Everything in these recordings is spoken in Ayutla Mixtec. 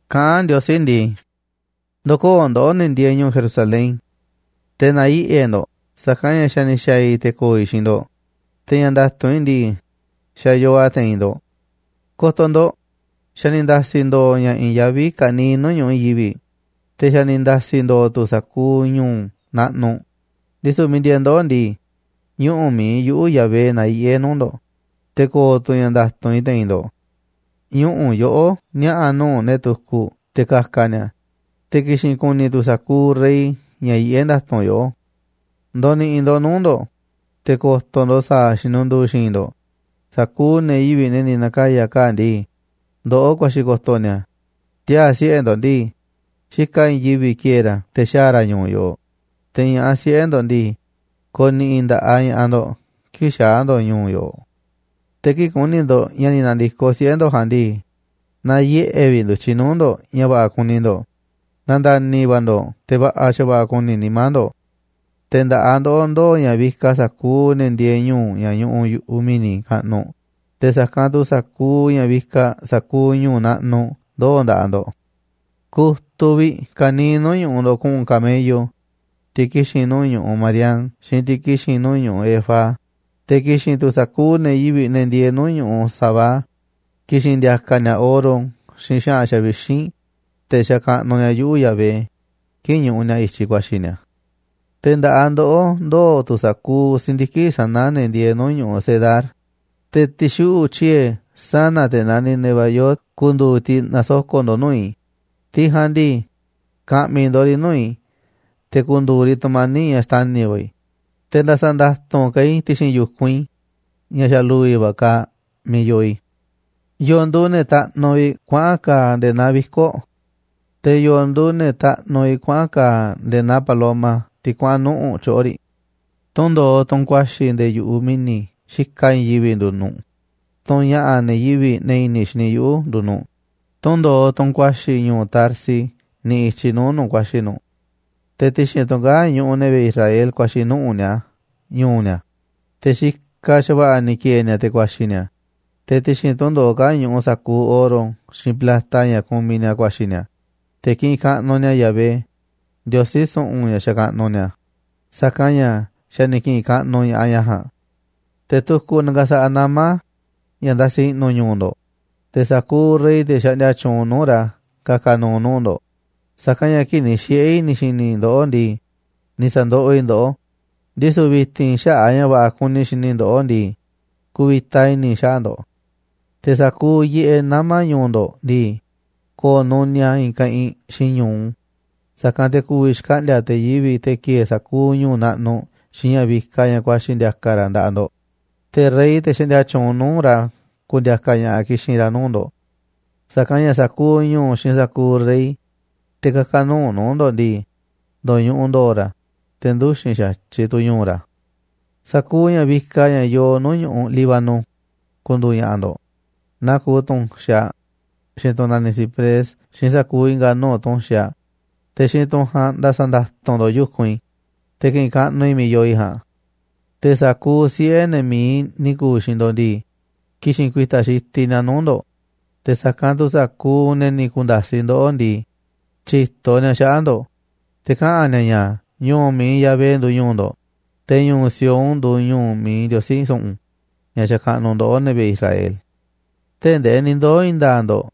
Kaꞌán Ndiosí ndii: “Ndo̱koo̱ ndoꞌó, ne̱ ndieeꞌ ñu̱u̱ Jerusalén, te̱ na̱yiꞌe̱ ndo̱ꞌ, sa̱kanꞌ ña̱ xa̱ ni̱ xa̱a̱ i̱ te̱ ko̱o̱ i̱ xiinꞌ ndo̱ꞌ, te̱ ña̱ nda̱tu̱nꞌ i̱ ndii, xa̱ yoo a̱ te̱i̱n ndo̱ꞌ. Ko̱to̱ ndo̱ꞌ, xa̱ ni̱ nda̱si̱ ndo̱o̱ ña̱ i̱i̱n yaví ka̱niiꞌ nuu̱ꞌ ñu̱ꞌuꞌ i̱i̱n yivi̱ꞌ, te̱ xa̱ ni̱ nda̱si̱ ndo̱o̱ tu̱ sa̱kuuꞌ ñu̱u̱ naꞌnuꞌ. Ndisu̱ miiꞌ ndieeꞌ ndoꞌó ndii, ñuꞌu̱ mi̱iꞌ yuꞌu̱, Yahvé, na̱yiꞌe̱ nuu̱ꞌ ndo̱ꞌ, te̱ ko̱o̱ tu̱ ña̱ nda̱tu̱nꞌ i̱ te̱i̱n ndo̱ꞌ. Ñuꞌu̱ yoꞌó niaꞌa̱ nuu̱ꞌ ne̱ tukuꞌ te̱ ka̱ka̱ ni̱a̱, te̱ ki̱xi̱n ku̱ni̱ tu̱ sa̱kuuꞌ rey ña̱ yiꞌé nda̱tu̱nꞌ yoꞌó. ’Ndo̱ni̱ꞌi̱ ndo̱ꞌ nuu̱ꞌ ndo̱ꞌ, te̱ ko̱to̱ ndo̱ꞌ sa̱a̱ xinundu̱u̱ xi̱i̱nꞌ ndo̱ꞌ sa̱kuuꞌ ne̱ yivi̱ꞌ, ne̱ ni̱ na̱kaya̱ kaa̱ꞌ ndii, ndoꞌó ku̱a̱xi̱ ko̱to̱ ni̱a̱. Tiaa̱ siꞌe̱ ndo̱ꞌ ndii, xikaꞌ i̱i̱n yivi̱ꞌ ki̱e̱e̱ ra̱ te̱ xaa̱ ra̱ ñu̱u̱ yoꞌoꞌ. Te̱ ña̱ꞌaꞌ siꞌe̱ ndo̱ꞌ ndii, ko̱ni̱ꞌi̱ nda̱ꞌaꞌ ña̱ꞌaꞌ ndo̱ꞌ kii̱ꞌ xaa̱ ndo̱ꞌ ñu̱u̱ yoꞌoꞌ. Te̱ kii̱ꞌ ku̱ni̱ ndo̱ꞌ ña̱ ni̱ na̱ndi̱koꞌ siꞌe̱ ndo̱ꞌ ja̱a̱nꞌ ndii, na̱yiꞌe̱ vi̱ꞌ ndu̱tyiꞌ nuu̱ꞌ ndo̱ꞌ ña̱ va̱ꞌa̱ kuni ndo̱ꞌ, na̱nda̱ni̱ va̱ ndo̱ꞌ te̱ va̱ꞌa̱ xa̱va̱ꞌa̱ ku̱ni̱ nimá ndo̱ꞌ. Te̱ nda̱ꞌaꞌ ndoꞌó ndooꞌ ña̱ vikaꞌ sa̱kuuꞌ ne̱ ndieeꞌ ñu̱u̱ ña̱ ñuꞌuꞌ yu̱ꞌuꞌ mi̱ni̱ kaꞌnuꞌ, te̱ sa̱kanꞌ tu̱ sa̱kuuꞌ ña̱ vikaꞌ sa̱kuuꞌ ñu̱u̱ naꞌnuꞌ ndooꞌ nda̱ꞌaꞌ ndo̱ꞌ. Ku̱tuꞌ vi̱ꞌ ka̱niiꞌ nuu̱ꞌ ñu̱ꞌuꞌ ndo̱ꞌ ku̱ꞌu̱n camello, tiꞌ ki̱xi̱n nuu̱ꞌ ñu̱ꞌuꞌ Madián xiinꞌ tiꞌ ki̱xi̱n nuu̱ꞌ ñu̱ꞌuꞌ Efa. Te̱ ki̱xi̱n tu̱ sa̱kuuꞌ ne̱ yivi̱ꞌ, ne̱ ndieeꞌ nuu̱ꞌ ñu̱ꞌuꞌ Sabá, ki̱xi̱n ndi̱a̱ka̱ ni̱a̱ oro xiinꞌ xa̱ꞌa̱n xavixínꞌ, te̱ xakaꞌnuꞌ ni̱a̱ yuꞌu, Yahvé, kii̱ꞌ ñuꞌuꞌ ni̱a̱ i̱tyiꞌ ku̱a̱xi̱ ni̱a̱. Te̱ nda̱ꞌaꞌ ndoꞌó ndoo̱ tu̱ sa̱kuuꞌ si̱ndiki̱ꞌ sa̱na̱ ne̱ ndieeꞌ ñu̱ꞌuꞌ Cedar, te̱ ti̱xuꞌu̱ꞌ tyiee̱ sana̱ te̱ naniꞌ Nebaiot ku̱ndu̱u̱ tiꞌ na̱soko̱ꞌ ndo̱ꞌ nuu̱ꞌ i̱. Tiꞌ ja̱a̱nꞌ ndii, ka̱ꞌmi̱ ndo̱ꞌ riꞌ nuu̱ꞌ i̱ te̱ ku̱ndu̱u̱ riꞌ tu̱mani̱ꞌ ña̱ xtani̱ va̱ i̱, te̱ nda̱sa̱ nda̱tu̱nꞌ ka̱ i̱ ti̱xi̱n yu̱kunꞌ i̱ ña̱ xa̱ lu̱vi̱ va̱ kaaꞌ miiꞌ yoo i̱. ’¿Yo̱o̱ nduuꞌ ne̱ taꞌnuꞌ vi̱ꞌ kuaꞌa̱n kaa̱ꞌ nde̱e̱ naa viko̱ꞌ? ¿Te̱ yo̱o̱ nduuꞌ ne̱ taꞌnuꞌ vi̱ꞌ kuaꞌa̱n kaa̱ꞌ nde̱e̱ naa paloma tiꞌ kuaꞌa̱n nuꞌu̱ꞌ tyoꞌo̱ riꞌ? Tundo̱oꞌ, tunꞌ ku̱a̱xi̱ nde̱e̱ yu̱ꞌuꞌ mi̱ni̱ xikaꞌ i̱i̱n yivi̱ꞌ nduuꞌ nu̱ꞌ, tunꞌ ña̱ꞌa̱ ne̱ yivi̱ꞌ, ne̱ i̱ni̱ xini yuꞌu̱, nduuꞌ nu̱ꞌ, te̱ tundo̱oꞌ, tunꞌ ku̱a̱xi̱ ñu̱u̱ Tarsis niꞌiꞌ i̱tyiꞌ nuu̱ꞌ nu̱ꞌ ku̱a̱xi̱ nu̱ꞌ. Te̱ ti̱xi̱n tunꞌ kaa̱ꞌ ñuꞌuꞌ ne̱ vi̱ꞌe̱ Israel ku̱a̱xi̱ nuꞌu̱ꞌ ni̱a̱ ñu̱u̱ ni̱a̱, te̱ xikaꞌ xa̱va̱ꞌa̱ ni̱ ki̱e̱e̱ ni̱a̱ te̱ ku̱a̱xi̱ ni̱a̱. Te̱ ti̱xi̱n tunꞌ ndo̱oꞌ kaa̱ꞌ ñuꞌuꞌ sa̱kuuꞌ oro xiinꞌ plata ña̱ kumiꞌ ni̱a̱ ku̱a̱xi̱ ni̱a̱, te̱ ki̱ꞌi̱n kaꞌnuꞌ ni̱a̱ Yahvé, Ndiosí su̱ꞌu̱n, ña̱ xakaꞌnuꞌ ni̱a̱, sa̱kanꞌ ña̱ xa̱ ni̱ ki̱ꞌi̱n kaꞌnuꞌ ña̱ꞌaꞌ ña̱ ja̱a̱nꞌ. ’Te̱ tukuꞌ na̱ka̱sa̱ꞌa̱ nama̱ ña̱ ndasi i̱ꞌnu̱ ñu̱u̱ ndo̱ꞌ, te̱ sa̱kuuꞌ rey, te̱ xaꞌndia tyuunꞌ nuu̱ꞌ ra̱ ka̱ka̱ nu̱u̱ nuu̱ꞌ ndo̱ꞌ. Sa̱kanꞌ ña̱ kii̱ꞌ ni̱ xiꞌe̱ i̱ ni̱ xi̱ni̱ ndoꞌó ndii, ni̱ sa̱ndoꞌoꞌ i̱ ndoꞌó, ndisu̱ vi̱ti̱n xaꞌa̱ꞌ a̱ ña̱ va̱ꞌa̱ kuni i̱ xini i̱ ndoꞌó ndii, ku̱vi̱ta i̱ni̱ i̱ xaꞌa̱ꞌ ndo̱ꞌ. Te̱ sa̱kuuꞌ yiꞌeꞌ nama̱ ñu̱u̱ ndo̱ꞌ ndii, ko̱o̱ nuniaꞌ a̱ i̱i̱n keꞌinꞌ xiinꞌ ñu̱u, sa̱kanꞌ te̱ ku̱vi̱ xkaꞌndi̱a̱ te̱ yivi̱ꞌ, te̱ ki̱e̱e̱ sa̱kuuꞌ ñu̱u̱ naꞌnuꞌ xiinꞌ ña̱ vikaꞌ ña̱ ku̱a̱xi̱ ndi̱a̱ka̱ ra̱ nda̱ꞌaꞌ ndo̱ꞌ. Te̱ rey, te̱ xaꞌndia tyuunꞌ nuu̱ꞌ ra̱, ku̱ndi̱a̱ka̱ ña̱ꞌaꞌ ki̱xi̱n ra̱ nuu̱ꞌ ndo̱ꞌ. Sa̱kanꞌ ña̱ sa̱kuuꞌ ñu̱u̱ xiinꞌ sa̱kuuꞌ rey, te̱ kä̱ka̱ nu̱u̱ nuu̱ꞌ ndo̱ꞌ ndii, ndo̱ñuꞌuꞌ ndo̱o̱ ra̱, te̱ nduxi̱n xa̱tyiꞌ tu̱ ñu̱u̱ ra̱. ’Sa̱kuuꞌ ña̱ vikaꞌ ña̱ yoo nuu̱ꞌ ñu̱ꞌuꞌ Líbano ku̱ndu̱u̱ ña̱ꞌa̱ ndo̱ꞌ, naa kuuꞌ tu̱nxaꞌ, xiinꞌ tunꞌ naniꞌ ciprés, xiinꞌ sa̱kuuꞌ i̱nga̱ nuu̱ꞌ tu̱nxaꞌ, te̱ xiinꞌ tunꞌ ja̱a̱nꞌ nda̱sa̱ nda̱tu̱nꞌ ndo̱ꞌ yu̱kunꞌ i̱, te̱ ki̱ꞌi̱n kaꞌnuꞌ i̱ miiꞌ yoo i̱ ja̱a̱nꞌ. Te̱ sa̱kuuꞌ siꞌe̱ ne̱ mi̱iꞌ ni̱ ku̱u̱ xiinꞌ ndo̱ꞌ ndii, ki̱xi̱n ku̱i̱ta̱ xitiꞌ ni̱a̱ nuu̱ꞌ ndo̱ꞌ. Te̱ sa̱kanꞌ tu̱ sa̱kuuꞌ ne̱ ni̱ ku̱nda̱siꞌ ndoꞌó ndii, tyi̱to ni̱a̱ xaꞌa̱ꞌ ndo̱ꞌ. Te̱ kaꞌa̱n ni̱a̱ ña̱ ñu̱u̱ mi̱iꞌ Yahvé nduuꞌ ñu̱u̱ ndo̱ꞌ, te̱ ñu̱u̱ Sión nduuꞌ ñu̱u̱ mi̱iꞌ Ndiosí su̱ꞌu̱n, ña̱ xakaꞌnuꞌ ndoꞌó, ne̱ vi̱ꞌe̱ Israel. ’Tee̱ꞌ ndee ni̱ ndoo̱ i̱i̱n nda̱a̱ꞌ ndo̱ꞌ,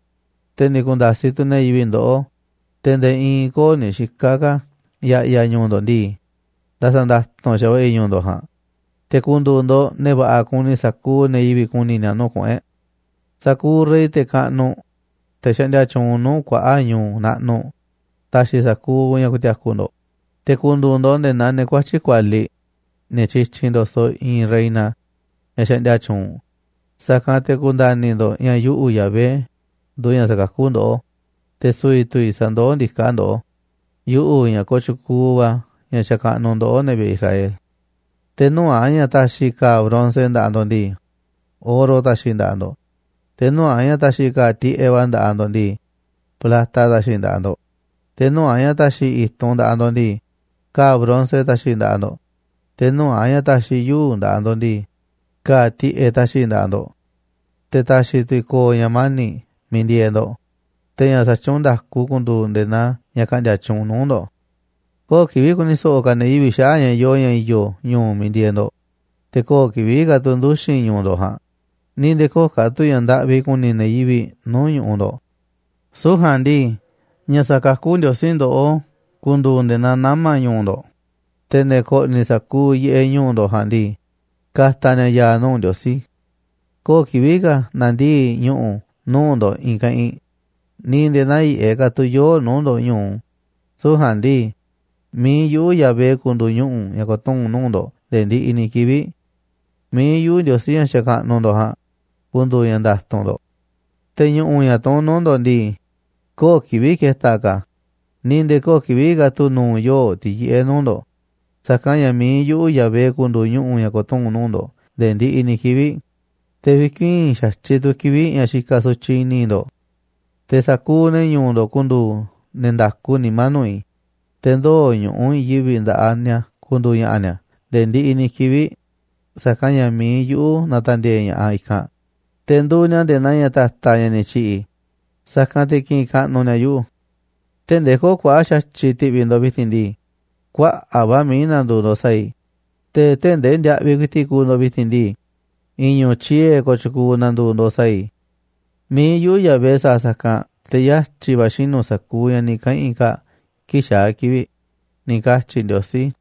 te̱ ni̱ ku̱nda̱siꞌ tu̱ ne̱ yivi̱ꞌ ndoꞌó, te̱ nde̱e̱ i̱i̱n köo̱ꞌ ni̱ xika̱ ka̱ ya̱ꞌya̱ ñu̱u̱ ndo̱ꞌ ndii, nda̱sa̱ nda̱tu̱nꞌ xa̱va̱ꞌa̱ i̱ ñu̱u̱ ndo̱ꞌ ja̱a̱nꞌ, te̱ ku̱ndu̱u̱ ndo̱ꞌ ne̱ va̱ꞌa̱ kuni sa̱kuuꞌ ne̱ yivi̱ꞌ ku̱ni̱ ni̱a̱ nuu̱ꞌ kuꞌu̱n e̱ꞌ. Sa̱kuuꞌ rey, te̱ kaꞌnuꞌ, te̱ xaꞌndia tyuunꞌ nuu̱ꞌ kuaꞌa̱ꞌ ñu̱u̱ naꞌnuꞌ, ta̱xi̱ sa̱kuuꞌ ña̱ ku̱ti̱a̱ku̱ ndo̱ꞌ, te̱ ku̱ndu̱u̱ ndo̱ꞌ nde̱e̱ naa ne̱ kuatyi̱ꞌ kualiꞌ, ne̱ tyityinꞌ ndo̱soꞌ i̱i̱n reina, ñaꞌ xaꞌndia tyuunꞌ. Sa̱kanꞌ te̱ ku̱nda̱ni̱ ndo̱ꞌ ña̱ yuꞌu̱, Yahvé, nduuꞌ ña̱ sakakú ndoꞌó, te̱ su̱vi̱ tu̱ i̱ sandoó ndiká ndoꞌó, yuꞌu̱ ña̱ kooꞌ tyukuuꞌ va̱, ña̱ xakaꞌnuꞌ ndoꞌó, ne̱ vi̱ꞌe̱ Israel. Te̱ nuu̱ꞌ a̱ ña̱ ta̱xi̱ ka̱a̱ bronce nda̱ꞌaꞌ ndo̱ꞌ ndii, oro ta̱xi̱ i̱ nda̱ꞌaꞌ ndo̱ꞌ, te̱ nuu̱ꞌ a̱ ña̱ ta̱xi̱ i̱ ka̱a̱ tiꞌeꞌ va̱ nda̱ꞌaꞌ ndo̱ꞌ ndii, plata ta̱xi̱ i̱ nda̱ꞌaꞌ ndo̱ꞌ, te̱ nuu̱ꞌ a̱ ña̱ ta̱xi̱ i̱ i̱tunꞌ nda̱ꞌaꞌ ndo̱ꞌ ndii, ka̱a̱ bronce ta̱xi̱ nda̱ꞌaꞌ ndo̱ꞌ, te̱ nuu̱ꞌ a̱ ña̱ ta̱xi̱ i̱ yuu̱ꞌ nda̱ꞌaꞌ ndo̱ꞌ ndii, ka̱a̱ tiꞌeꞌ ta̱xi̱ i̱ nda̱ꞌaꞌ ndo̱ꞌ. Te̱ ta̱xi̱ tu̱ i̱ ko̱o̱ ña̱ mani̱ꞌ miiꞌ ndieeꞌ ndo̱ꞌ, te̱ ña̱ xatyuunꞌ nda̱ku ku̱ndu̱u̱ nde̱e̱ naa ña̱ ka̱ꞌndi̱a̱ tyuunꞌ nuu̱ꞌ ndo̱ꞌ. Köo̱ꞌ kivi̱ꞌ ku̱ni̱ so̱ꞌo̱ ka̱ ne̱ yivi̱ꞌ xaꞌa̱ꞌ ña̱ yoo ña̱ i̱yo̱ ñu̱u̱ miiꞌ ndieeꞌ ndo̱ꞌ, te̱ köo̱ꞌ kivi̱ꞌ ka̱ tu̱ nduxi̱n ñu̱u̱ ndo̱ꞌ ja̱a̱nꞌ, ni̱ nde̱e̱ köo̱ꞌ ka̱ tu̱ ña̱ ndaꞌvi kuni ne̱ yivi̱ꞌ nuu̱ꞌ ñu̱ꞌuꞌ ndo̱ꞌ. Süu̱ꞌ ja̱a̱nꞌ ndii, ña̱ sa̱kakú Ndiosí ndoꞌó ku̱ndu̱u̱ nde̱e̱ naa nama̱ ñu̱u̱ ndo̱ꞌ, te̱ ne̱ ko̱ꞌni̱ sa̱kuuꞌ yiꞌeꞌ ñu̱u̱ ndo̱ꞌ ja̱a̱nꞌ ndii, ka̱ta̱ ni̱a̱ ya̱a̱ nuu̱ꞌ Ndiosí. ’Köo̱ꞌ kivi̱ꞌ ka̱ na̱ndii̱ꞌ ñu̱ꞌu̱ nuu̱ꞌ ndo̱ꞌ i̱i̱n keꞌinꞌ, ni̱ nde̱e̱ nä̱yiꞌe̱ ka̱ tu̱ yoo̱ꞌ nuu̱ꞌ ndo̱ꞌ ñu̱u, süu̱ꞌ ja̱a̱nꞌ ndii, mi̱iꞌ yuꞌu̱, Yahvé, ku̱ndu̱u̱ ñuꞌu̱ ña̱ ko̱tuu̱n nuu̱ꞌ ndo̱ꞌ nde̱e̱ ndiꞌiꞌ ni̱ kivi̱ꞌ. Mi̱iꞌ yuꞌu̱, Ndiosí ña̱ xakaꞌnuꞌ ndo̱ꞌ ja̱a̱nꞌ, ku̱ndu̱u̱ ña̱ nda̱tu̱nꞌ ndo̱ꞌ. Te̱ ñu̱ꞌu̱, ña̱ tuún nuu̱ꞌ ndo̱ꞌ ndii, köo̱ꞌ kivi̱ꞌ keta̱ ka̱ a̱, ni̱ nde̱e̱ köo̱ꞌ kivi̱ꞌ ka̱ tu̱ nu̱u̱ yoo̱ꞌ, tiꞌ yiꞌé nuu̱ꞌ ndo̱ꞌ. Sa̱kanꞌ ña̱ mi̱iꞌ yuꞌu̱, Yahvé, ku̱ndu̱u̱ ñuꞌu̱ ña̱ ko̱tuu̱n nuu̱ꞌ ndo̱ꞌ nde̱e̱ ndiꞌiꞌ ni̱ kivi̱ꞌ, te̱ vi̱kuii̱n xa̱tyiꞌ tu̱ kivi̱ꞌ ña̱ xikaꞌ sutyiꞌ i̱ni̱ ndo̱ꞌ. Te̱ sa̱kuuꞌ ne̱ ñu̱u̱ ndo̱ꞌ ku̱ndu̱u̱ ne̱ nda̱ku nimá nuu̱ꞌ i̱. Te̱ ndoo̱ ñu̱ꞌuꞌ i̱i̱n yivi̱ꞌ nda̱ꞌaꞌ ni̱a̱ ku̱ndu̱u̱ ña̱ꞌa̱ ni̱a̱ nde̱e̱ ndiꞌiꞌ ni̱ kivi̱ꞌ, sa̱kanꞌ ña̱ mi̱iꞌ yuꞌu̱ na̱ta̱ndi̱e̱e̱ ña̱ꞌaꞌ i̱kanꞌ, te̱ nduuꞌ ni̱a̱ nde̱e̱ naa ña̱ ta̱ta̱ ña̱ ni̱ tyi̱ꞌi̱ i̱, sa̱kanꞌ te̱ ki̱ꞌi̱n kaꞌnuꞌ ni̱a̱ yuꞌu̱. Tee̱ꞌ ndee köo̱ꞌ kuaꞌa̱ꞌ xa̱tyiꞌ ti̱ꞌvi̱ ndo̱ꞌ vi̱ti̱n ndii, kuaꞌa̱ꞌ va̱ mií na̱ndu̱u̱ ndo̱ꞌ sa̱a̱ i̱, te̱ tee̱ꞌ ndee ndiaꞌviꞌ ku̱i̱ti̱ꞌ kuuꞌ ndo̱ꞌ vi̱ti̱n ndii, i̱i̱n ñu̱u̱ tyiee̱ kooꞌ tyukuuꞌ na̱ndu̱u̱ ndo̱ꞌ sa̱a̱ i̱. Mi̱iꞌ yuꞌu̱, Yahvé, sa̱a̱ sa̱kanꞌ te̱ yatyi̱ va̱ xinu̱ sa̱kuuꞌ ña̱ ni̱ kaꞌa̱n i̱ kaa̱ꞌ kii̱ꞌ xaa̱ kivi̱ꞌ”, ni̱ katyi̱ Ndiosí.